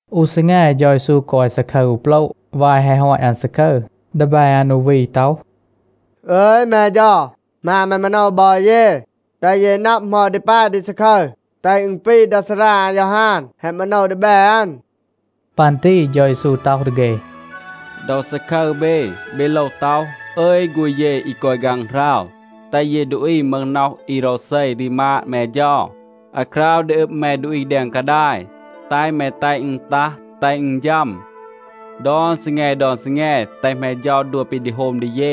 อู ซีแง, เฌา เยซู กอย ซาคึร อู โปละ. วาย แฮะ ฮอต อัน ซาคึร, ดีแบ อัน อู วี ต็อห, “อึย แม เฌา, หมาณ แม มาโนว บอ เย, แตห เย นับ เหมา ดี ปาย ดี ซาคึร, แตห อึณ ปี ดา ซารา อายอฮาน แฮะ มาโนว ดีแบ อัน.” ปัน ตี เฌา เยซู ต็อห ดี เฆ, “ดอ ซาคึร เบ, เบ โลว ต็อห, ‘อึย ฆูณ เย อี กอย ฆางหราว, แตห เย ดูอี มึห น็อห อี โรวเซ รีมาด แม เฌา. อาคราว ดี อึบ แม ดูอี แดง กาดาย, แตห แม แตห อึณ ตัห, แตห อึณ ฌัม. ดอน ซีแง ดอน ซีแง แตห แม เฌา ดัว ปี ดี โฮม ดี เย.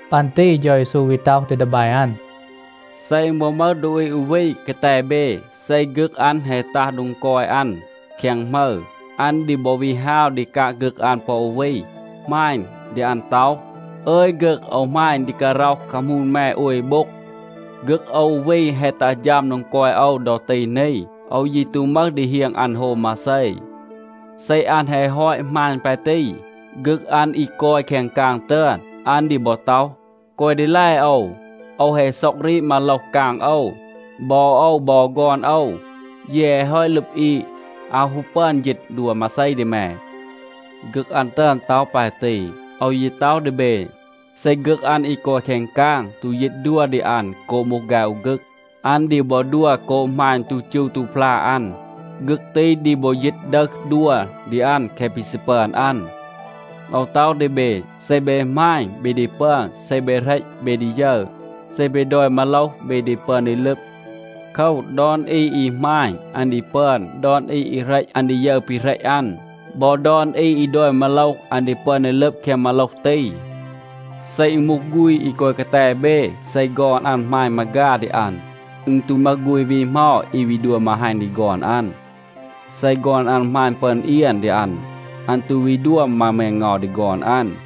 ปัน ตี เฌา เยซู วี ต็อห ดี ดีแบ อัน, “เซ อึณ บอ มึห ดูอี อู วี กาแต เบ, เซ ฆึก อัน แฮะ ตัห โดง กอย อัน แคง หมึร, อัน ดี บอ วี ฮาว ดี กาง ฆึก อัน ปอ วี, หมาณ ดี อัน ต็อห, ‘อึย ฆึก, โอว หมาณ ดี การ็อห คามูน แม โอย โบ็ง. ฆึก โอว อู วี แฮะ ตัห ฌัม โดง กอย โอว ดอ ตี นี. โอว ยี ตู มึห ดี เฮียง อัน โฮม มาเซ.’ เซ อัน แฮะ ฮอต หมาณ ปาย ตี, ฆึก อัน อี กอย แคง กาง ตึอน, อัน ดี บอ ต็อห, ‘แกวะ ดีแล โอว. โอว แฮะ ซ็อง รีด มาโลห กาง โอว. บอ โอว บอ ฆอน โอว, เย แฮะ ฮอต ลึบ อีด. อาว ฮู ปึอน ยีต ดัว มาเซ ดี แม.’ ฆึก อัน ตึอน ต็อห ปาย ตี. โอว ยี ต็อห ดี เบ, เซ ฆึก อัน อี กอย แคง กาง ตู ยีต ดัว ดี อัน โกบ มูห ฆาย อู ฆึก, อัน ดี บอ ดัว โกบ หมาณ ตู จู ตู พลา อัน. ฆึก ตี ดี บอ ยีต ดึห ดัว ดี อัน แคะ ปี ซี ปึอน อัน. โอว ต็อห ดี เบ, เซ เบ หมาณ, เบ ดี ปึอน. เซ เบ เหรต, เบ ดี ยึร. เซ เบ ดอย มาโลห, เบ ดี ปึอน ดี ลึบ. โคว, ดอน อี อี หมาณ, อัน ดี ปึอน. ดอน อี อี เหรต, อัน ดี ยึร ปี เหรต อัน. บอ ดอน อี อี ดอย มาโลห, อัน ดี ปึอน ดี ลึบ แคง มาโลห ตี. เซ อึณ มูห ฆูณ อี กอย กาแต เบ, เซ ฆอน อัน หมาณ มาฆา ดี อัน, อึณ ตู มึห ฆูณ วี เหมา อี วี ดัว มาฮัณ ดี ฆอน อัน. เซ ฆอน อัน หมาณ ปึอน เอียน ดี อัน, อัน ตู วี ดัว มา แมงเงา ดี ฆอน อัน.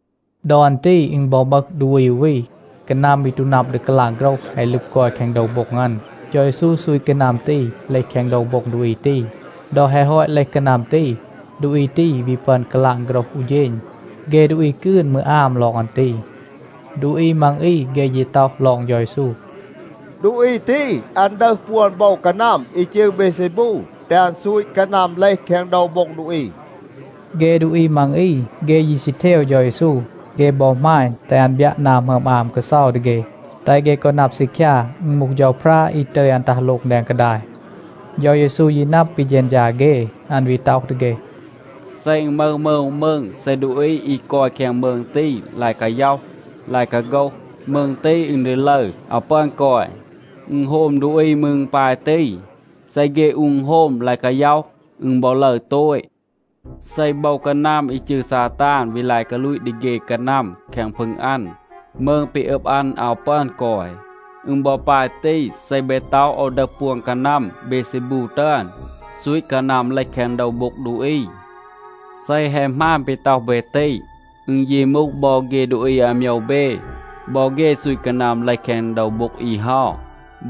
ดอ อัน ตี อึณ บอ มึห ดูอี อู วี. กานัม อี ตู นับ ดี กาลาง โฆรห แฮะ ลึบ กอย แคง โดว โบ็ง อัน. เฌา เยซู ซูต กานัม ตี เลห แคง โดว โบ็ง ดูอี ตี. ดอ แฮะ ฮอต เลห กานัม ตี, ดูอี ตี วี ปึอน กาลาง โฆรห อู เฌณ. เฆ ดูอี กืน มืร อาม ลอง อัน ตี. ดูอี มัง อี, เฆ ยี ต็อห ลอง เฌา เยซู, “ดูอี ตี, อัน ดึห ปวน โบว กานัม อี จืร เบเซบู,b แตห อัน ซูต กานัม เลห แคง โดว โบ็ง ดูอี.” เฆ ดูอี มัง อี, เฆ ยี ซี เทว เฌา เยซู. เฆ บอ หมาณ, แตห อัน บยัะ นา หมึอม อาม กาเซา ดี เฆ, แตห เฆ กอ นับ ซีคยา, อึณ มูห เฌาพรา, อี ตึย อัน ตัห โลง แดง กาดาย. เฌา เยซู ยี นับ ปี เฌณฌา เฆ. อัน วี ต็อห ดี เฆ, “เซ อึณ มึห มืง อู มืง, เซ ดูอี อี กอย แคง มืง ตี ลาย กาย็อห ลาย กาโฆห, มืง ตี, อึณ ดี ลึร, อาว ปึอน กอย. อึณโฮม ดูอี มืร ปาย ตี. เซ เฆ อู อึณโฮม ลาย กาย็อห, อึณ บอ ลึร โตต. เซ โบว กานัม อี จืร ซาตาน วี ลาย กาลูต ดี เฆ กานัม แคง พึง อัน, มืง ปี อึบ อัน อาว ปึอน กอย. อึณ บอ ปาย ตี, เซ เบ ต็อห, โอว ดึห ปวน กานัม เบเซบู ตึอน, ซูต กานัม เลห แคง โดว โบ็ง ดูอี. เซ แฮะ หมาน ปี ต็อห เบ ตี, อึณ ยี มูห บอ เฆ ดูอี อาโมยว เบ, บอ เฆ ซูต กานัม เลห แคง โดว โบ็ง อี เฮา.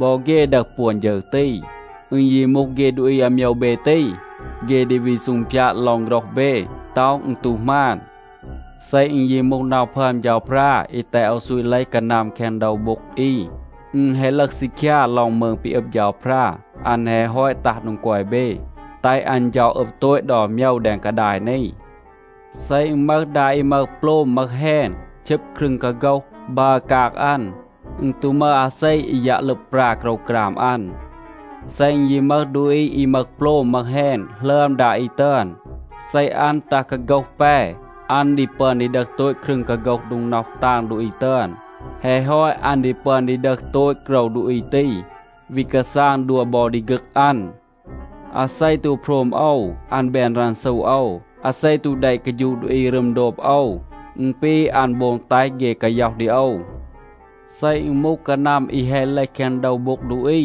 บอ เฆ ดึห ปวน ฌึร ตี. อึณ ยี มูห เฆ ดูอี อาโมยว เบ ตี, เฆ ดี วี ซูงพยาด ลอง โฆรห เบ, ต็อห อึณ ตู หมาน. เซ อึณ ยี มูห น็อห พึอม เฌาพรา อี แตห โอว ซูต เลห กานัม แคง โดว โบ็ง อี, อึณ แฮะ ลึห ซีคยา ลอง มืง ปี อึบ เฌาพรา. อัน แฮะ ฮอต ตัห โดง กอย เบ, แตห อัน เฌา อึบ โตต ดอน โมยว แดง กาดาย นี. เซ อึณ มึห ดา อี มึห โปลม มึห แฮณ, ชึบ ครึง กาโฆห, บัร กาง อัน, อึณ ตู มึห อาเซ อี ยัะ ลึบ ปรา โกรวกราม อัน. เซ อึณ ยี มึห ดูอี อี มึห โปลม มึห แฮณ หลึอม ดา อี ตึอน, เซ อัน ตัห กาโฆห แป, อัน ดี ปึอน ดี ดึห โตต ครึง กาโฆห โดง น็อห ตาง ดูอี ตึอน. แฮะ ฮอต, อัน ดี ปึอน ดี ดึห โตต โกรว ดูอี ตี, วี กาซาง ดัว บอ ดี ฆึก อัน. อาเซ ตู โพรม โอว, อัน แบน รันซู โอว. อาเซ ตู แดะ กาฌูะ ดูอี รึม โดบ โอว, อึณ ปี อัน โบง แตห เฆ กาย็อห ดี โอว. เซ อึณ มูห กานัม อี แฮะ เลห แคง โดว โบ็ง ดูอี,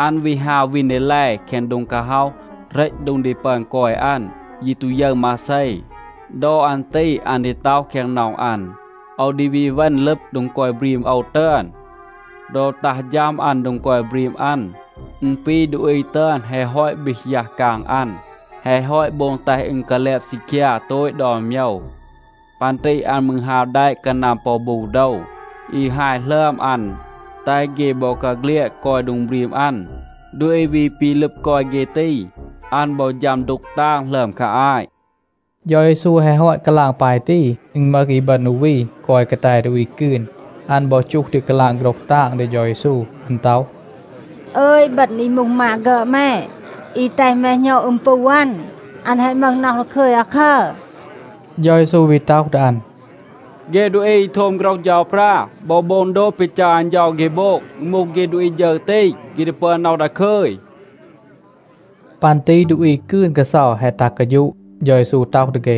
อัน วี ฮาว วีน ดี แล แคง โดง กาฮ็อห, เหรต โดง ดี ปึอน กอย อัน, ยี ตู ยึร มาเซ. ดอ อัน ตี อัน ดี ต็อห แคง น็อห อัน, ‘โอว ดี วี เวณ ลึบ โดง กอย บรีม โอว ตึอน.’ ดอ ตัห ฌัม อัน โดง กอย บรีม อัน, อึณ ปี ดูอี ตึอน แฮะ ฮอต บีห ยัห กาง อัน, แฮะ ฮอต โบง แตห อึณ กาแลบ ซีคยา โตต ดอน โมยว. ปัน ตี อัน มืร ฮาว แดะ กานัม ปอ บู โดว, อี ฮาย หลึอม อัน, แตห เฆ บอกาเฆลียด กอย โดง บรีม อัน. ดูอี วี ปี ลึบ กอย เฆ ตี, อัน บอ ฌัม ดูก ตาง หลึอม คา อาต.” เฌา เยซู แฮะ ฮอต กาลาง ปาย ตี, อึณ มึห อีบึณ อู วี กอย กาแต ดูอี กืน. อัน บอ จูห ดี กาลาง โฆรห ตาง ดี เฌา เยซู. อัน ต็อห, “อึย, อีบึณ อี มูห มา ฆึอด แม, อี แตห แม หณอด อึม ปู อัน, อัน แฮะ มึห น็อห ดาคึย อาคัร.” เฌา เยซู วี ต็อห ดี อัน, “เฆ ดูอี อี โทม โฆรห เฌาพรา บอ โบง โดบ ปี จัร อัน เฌา เฆ โบง, อึณ มูห เฆ ดูอี ฌึร ตี, เฆ ดี ปึอน น็อห ดาคึย.” ปัน ตี ดูอี กืน กาเซา แฮะ ตัห กาฌูะ. เฌา เยซู ต็อห ดี เฆ,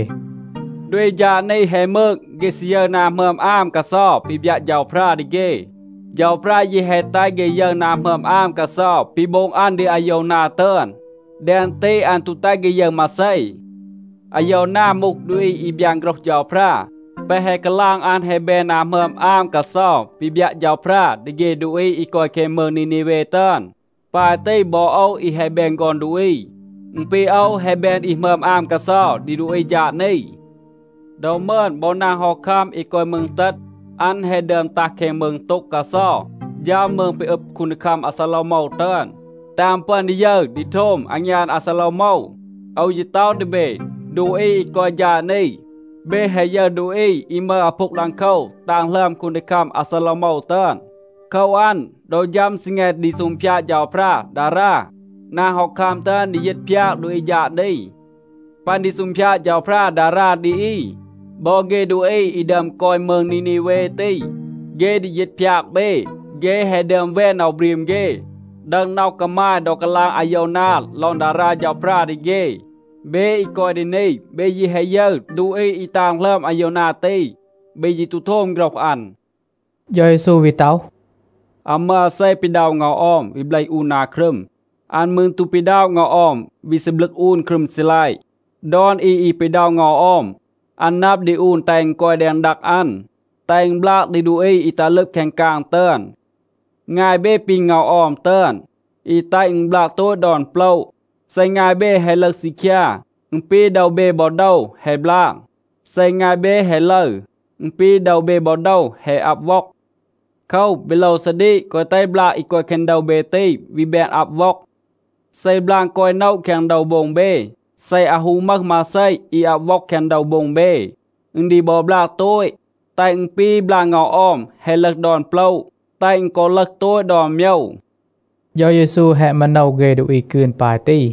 “ดูอี ฌาด นี แฮะ มืก. เฆ ซี ยึร นา หมึอม อาม กาเซา ปี บยัะ เฌาพรา ดี เฆ. เฌาพรา ยี แฮะ แตห เฆ ยึร นา หมึอม อาม กาเซา ปี โบง อัน ดี อาโยวนา ตึอน. แดง ตี อัน ตู แตห เฆ ยึร มาเซ. อาโยวนา มูห ดูอี อี บยาน โฆรห เฌาพรา. แปะ แฮะ กาลาง อัน แฮะ แบน นา หมึอม อาม กาเซา ปี บยัะ เฌาพรา ดี เฆ ดูอี อี กอย แคง มืง นีนีเว ตึอน. ปาย ตี, บอ โอว อี แฮะ แบน ฆอน ดูอี, อึณ ปี โอว แฮะ แบน อี หมึอม อาม กาเซา ดี ดูอี ฌาด นี. ดอ มึอน, บอ นาง ฮอคัม อี กอย มืง เตต, อัน แฮะ ดึอม ตัห แคง มืง โต็ง กาเซา, ฌัม มืง ปี อึบ คูนดีคัม อาซาโลวโมว ตึอน, แตห อัน ปึอน ดี ยึร ดี โทม อางยาน อาซาโลวโมว. โอว ยี ต็อห ดี เบ ดูอี อี กอย ฌาด นี, เบ แฮะ ยึร ดูอี อี มึห อาพูง ดังโคว ตาง หลึอม คูนดีคัม อาซาโลวโมว ตึอน. โคว อัน, ดอ ฌัม ซีแง ดี ซูงพยาด เฌาพรา ดารา, นาง ฮอคัม ตึอน ดี ยีต พยาก ดูอี ฌาด นี. ปัน ดี ซูงพยาด เฌาพรา ดารา ดี อี, บอ เฆ ดูอี อี ดึอม กอย มืง นีนีเว ตี, เฆ ดี ยีต พยาก เบ. เฆ แฮะ ดึอม แวน น็อห บรีม เฆ, ดึห น็อห กามาย ดอ กาลาง อาโยวนา ลอง ดารา เฌาพรา ดี เฆ. เบ อี กอย ดี นี, เบ ยี แฮะ ยึร ดูอี อี ตาง หลึอม อาโยวนา ตี. เบ ยี ตู โทม โฆรห อัน.” เฌา เยซู วี ต็อห, “อาว มึห อาเซ อี ปีด็อะ เงา ออม, วี เบลห อูน นา ครึม. อัน มืร ตู ปีด็อะ เงา ออม วี ซีบลึก อูน ครึม ซีลัยะ. ดอน อี อี ปีด็อะ เงา ออม, อัน นับ ดี อูน แตห อัน กอย แดง ดัง อัน, แตห อึณ บลาง ดี ดูอี อี ตัห ลึบ แคง กาง ตึอน. งาย เบ ปี เงา ออม ตึอน, อี แตห อึณ บลาง โตต ดอน โปละ. เซ งาย เบ แฮะ ลึห ซีคยา, อึณ ปี โดว เบ บอ โดว แฮะ บลาง. เซ งาย เบ แฮะ ลึร, อึณ ปี โดว เบ บอ โดว แฮะ อับ ว็อง. โคว, เบ โลว ซาดีก, แกวะ แตห บลาง อี กอย แคง โดว เบ ตี วี แบน อับ ว็อง. เซ บลาง กอย โนะ แคง โดว โบ็ง เบ, เซ อาว ฮู มึห มาเซ อี อับ ว็อง แคง โดว โบ็ง เบ, อึณ ดี บอ บลาง โตต, แตห อึณ ปี บลาง เงา ออม แฮะ ลึห ดอน โปละ, แตห อึณ กอ ลึห โตต ดอน โมยว.” เฌา เยซู แฮะ มาโนว เฆ ดูอี กืน ปาย ตี.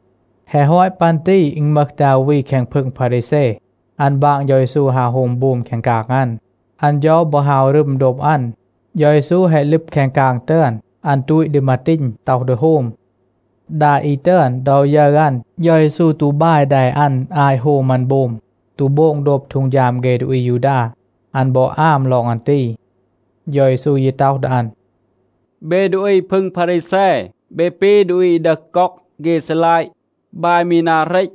แฮะ ฮอต ปัน ตี อึณ มึห ดา อู วี แคง พึง พารีแซ, อัน บาง เฌา เยซู ฮาว โฮม โบม แคง กาง อัน. อัน เฌา บอ ฮาว รึม โดบ อัน. เฌา เยซู แฮะ ลึบ แคง กาง ตึอน, อัน ตูต ดี มาตีณ, ต็อห ดี โฮม. ดา อี ตึอน, ดอ ยึร อัน, เฌา เยซู ตู บาย แด อัน อาต โฮม อัน โบม, ตู โบง โดบ ฮีด เฆ ดูอี อายูดา, อัน บอ อาม ลอง อัน ตี. เฌา เยซู ยี ต็อห ดี อัน, “เบ ดูอี พึง พารีแซ, เบ ปี ดูอี อี ดึห ก็อก เฆ ซีลัยะ, บาย มี นา เรต.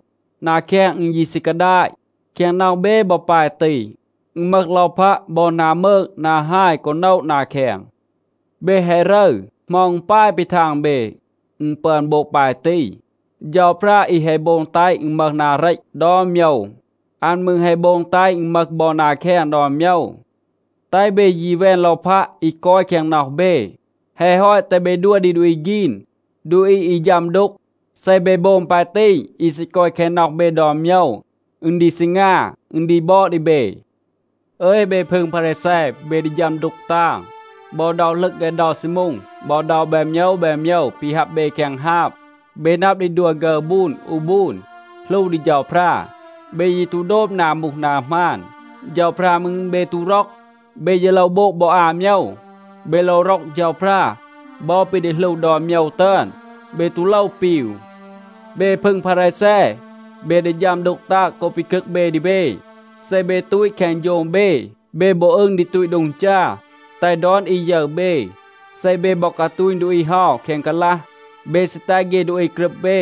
นา แคง อึณ ยี ซี กาดาต. แคง น็อห เบ บอ ปาย ตี. อึณ มึห ลอพัะ บอ นา มืก นา ฮาย กอ โนะ นา แคง. เบ แฮะ รึร. เหมา อึณ ปาย ปี ทาง เบ, อึณ ปึอน โบง ปาย ตี? เฌาพรา อี แฮะ โบง แตห อึณ มึห นา เรต ดอน โมยว, อัน มืร แฮะ โบง แตห อึณ มึห บอ นา แคง ดอน โมยว. แตห เบ ยี แวน ลอพัะ อี กอย แคง น็อห เบ. แฮะ ฮอต, แตห เบ ดัว ดี ดูอี ฆีน, ดูอี อี ฌัม ดูก. เซ เบ โบง ปาย ตี อี ซี กอย แคง น็อห เบ ดอน โมยว, อึณ ดี ซีงา, อึณ ดี บอด ดี เบ. อึย เบ พึง พารีแซ, เบ ดี ฌัม ดูก ตาง. บอ เดา หลึง ฆาย เดา ซีมูง บอ เดา แบน โมยว แบน โมยว ปี ฮับ เบ แคง ฮาบ, เบ นับ ดี ดัว ฆึร บูน อู บูน, หลู ดี เฌาพรา. เบ ยี ตู โดบ นา มูห นา หมาน. เฌาพรา มืร, เบ ตู ร็อก. เบ ยี โลว โบง บอ อา โมยว. เบ โลว ร็อก เฌาพรา, บอ ปี ดี หลู ดอน โมยว ตึอน, เบ ตู โลว ปีว. เบ พึง พารีแซ, เบ ดี ฌัม ดูก ตาง โกบ ปีคึก เบ ดี เบ. เซ เบ ตูต แคง โฌง เบ, เบ บอ อึง ดี ตูต โดง จา, แตห ดอน อี ยึร เบ. เซ เบ บอ กาตูณ ดูอี เฮา แคง กาลัห, เบ ซี แตห เฆ ดูอี กรึบ เบ.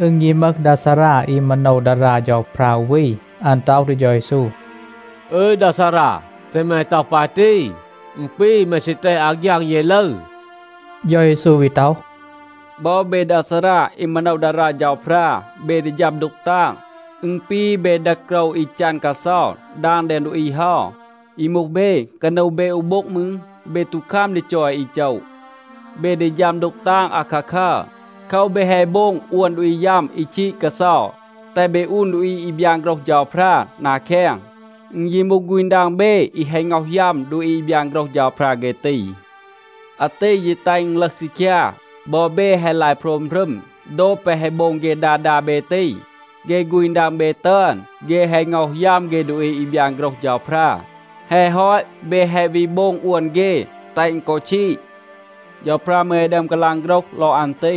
อึณ ยี มึห ดา ซารา อี มาโนว ดารา เฌาพรา อู วี, อัน ต็อห ดี เฌา เยซู, “อึย ดา ซารา, เซ แม ต็อห ปาย ตี, อึณ ปี, แม ซี แตห อาฆยาง เย ลึร.” เฌา เยซู วี ต็อห, “บอ เบ ดา ซารา อี มาโนว ดารา เฌาพรา, เบ ดี ฌัม ดูก ตาง. อึณ ปี เบ ดึห โกรว อี จัน กาเซา ดาง แดง ดูอี เฮา. อี มูห เบ, กานู เบ อู โบ็ง มืร, เบ ตู คัม ดี จอย อี โจะ. เบ ดี ฌัม ดูก ตาง อาคาคัร. โคว, เบ แฮะ โบง อวน ดูอี ยัม อี ชีด กาเซา, แตห เบ อูน ดูอี อี บยาน โฆรห เฌาพรา นา แคง. อึณ ยี มูห ฆูณ ดัง เบ, อี แฮะ ง็อห ยัม ดูอี อี บยาน โฆรห เฌาพรา เฆ ตี. อาตี ยี แตห อึณ ลึห ซีคยา, บอ เบ แฮะ ลาย โพรม รึม โดบ แปะ แฮะ โบง เฆ ดา ดา เบ ตี. เฆ ฆูณ ดัง เบ ตึอน, เฆ แฮะ ง็อห ยัม เฆ ดูอี อี บยาน โฆรห เฌาพรา. แฮะ ฮอต, เบ แฮะ วี โบง อวน เฆ, แตห อึณ กอ ชีด. เฌาพรา มืร แฮะ ดึอม กาลาง โฆรห ลอง อัน ตี.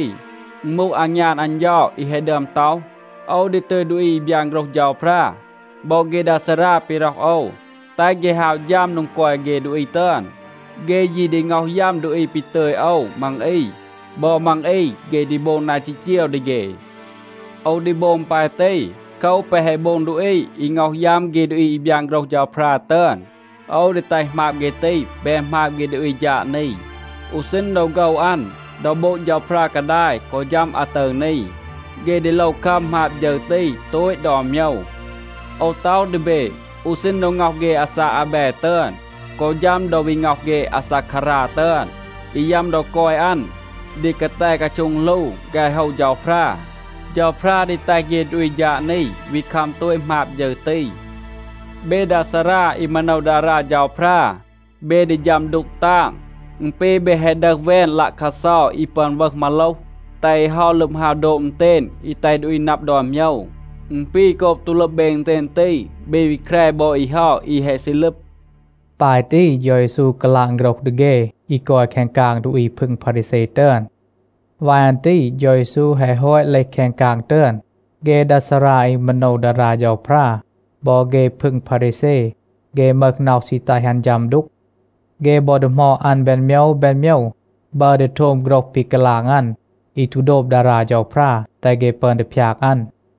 อึณ มูห อางยาน อัน เฌา อี แฮะ ดึอม ต็อห, ‘โอว ดี ตึย ดูอี อี บยาน โฆรห เฌาพรา บอ เฆ ดา ซารา ปี ร็อห โอว, แตห เฆ ฮาว ฌัม โดง กอย เฆ ดูอี ตึอน. เฆ ยี ดี ง็อห ยัม ดูอี ปี ตึย โอว มัง อี. บอ มัง อี, เฆ ดี โบง นา จีจีว ดี เฆ.’ โอว ดี โบง ปาย ตี. โคว, แปะ แฮะ โบง ดูอี, อี ง็อห ยัม เฆ ดูอี อี บยาน โฆรห เฌาพรา ตึอน, โอว ดี แตห หมาบ เฆ ตี แบน หมาบ เฆ ดูอี ฌาด นี. อู ซีณ ดอ โฆว อัน, ดอ โบง เฌาพรา กาดาย, กอ ฌัม อาตึร นี, เฆ ดี โลว คัม หมาบ ฌึร ตี โตต ดอน โมยว. โอว ต็อห ดี เบ, อู ซีณ ดอ ง็อห เฆ อาซาก อาแบ ตึอน, กอ ฌัม ดอ วี ง็อห เฆ อาซาคารา ตึอน, อี ยัม ดอ กอย อัน ดี กาแต กาโช็ง หลู ฆาย โฮว เฌาพรา, เฌาพรา ดี แตห เฆ ดูอี ฌาด นี วี คัม โตต หมาบ ฌึร ตี. เบ ดา ซารา อี มาโนว ดารา เฌาพรา, เบ ดี ฌัม ดูก ตาง. อึณ ปี เบ แฮะ ดึห แวน ลัะคัดเซา อี ปึอน วึห มาโลห, แตห อี เฮา ลึบ ฮาว โดบ อึณเตณ อี แตห ดูอี นับ ดอน โมยว. อึณ ปี, โกบ ตู ลึบ เบ อึณเตณ ตี, เบ วี แคร บอ อี เฮา อี แฮะ ซี ลึบ.” ปาย ตี เฌา เยซู กาลาง โฆรห ดี เฆ อี กอย แคง กาง ดูอี พึง พารีแซ ตึอน. วาย อัน ตี เฌา เยซู แฮะ ฮอต เลห แคง กาง ตึอน, เฆ ดา ซารา อี มาโนว ดารา เฌาพรา บอ เฆ พึง พารีแซ, เฆ มึห น็อห ซี แตห อัน ฌัม ดูก. เฆ บอ ดีหมอด อัน แบน โมยว แบน โมยว, บัร ดี โทม โฆรห ปี กาลาง อัน อี ตู โดบ ดารา เฌาพรา, แตห เฆ ปึอน ดี พยาก อัน.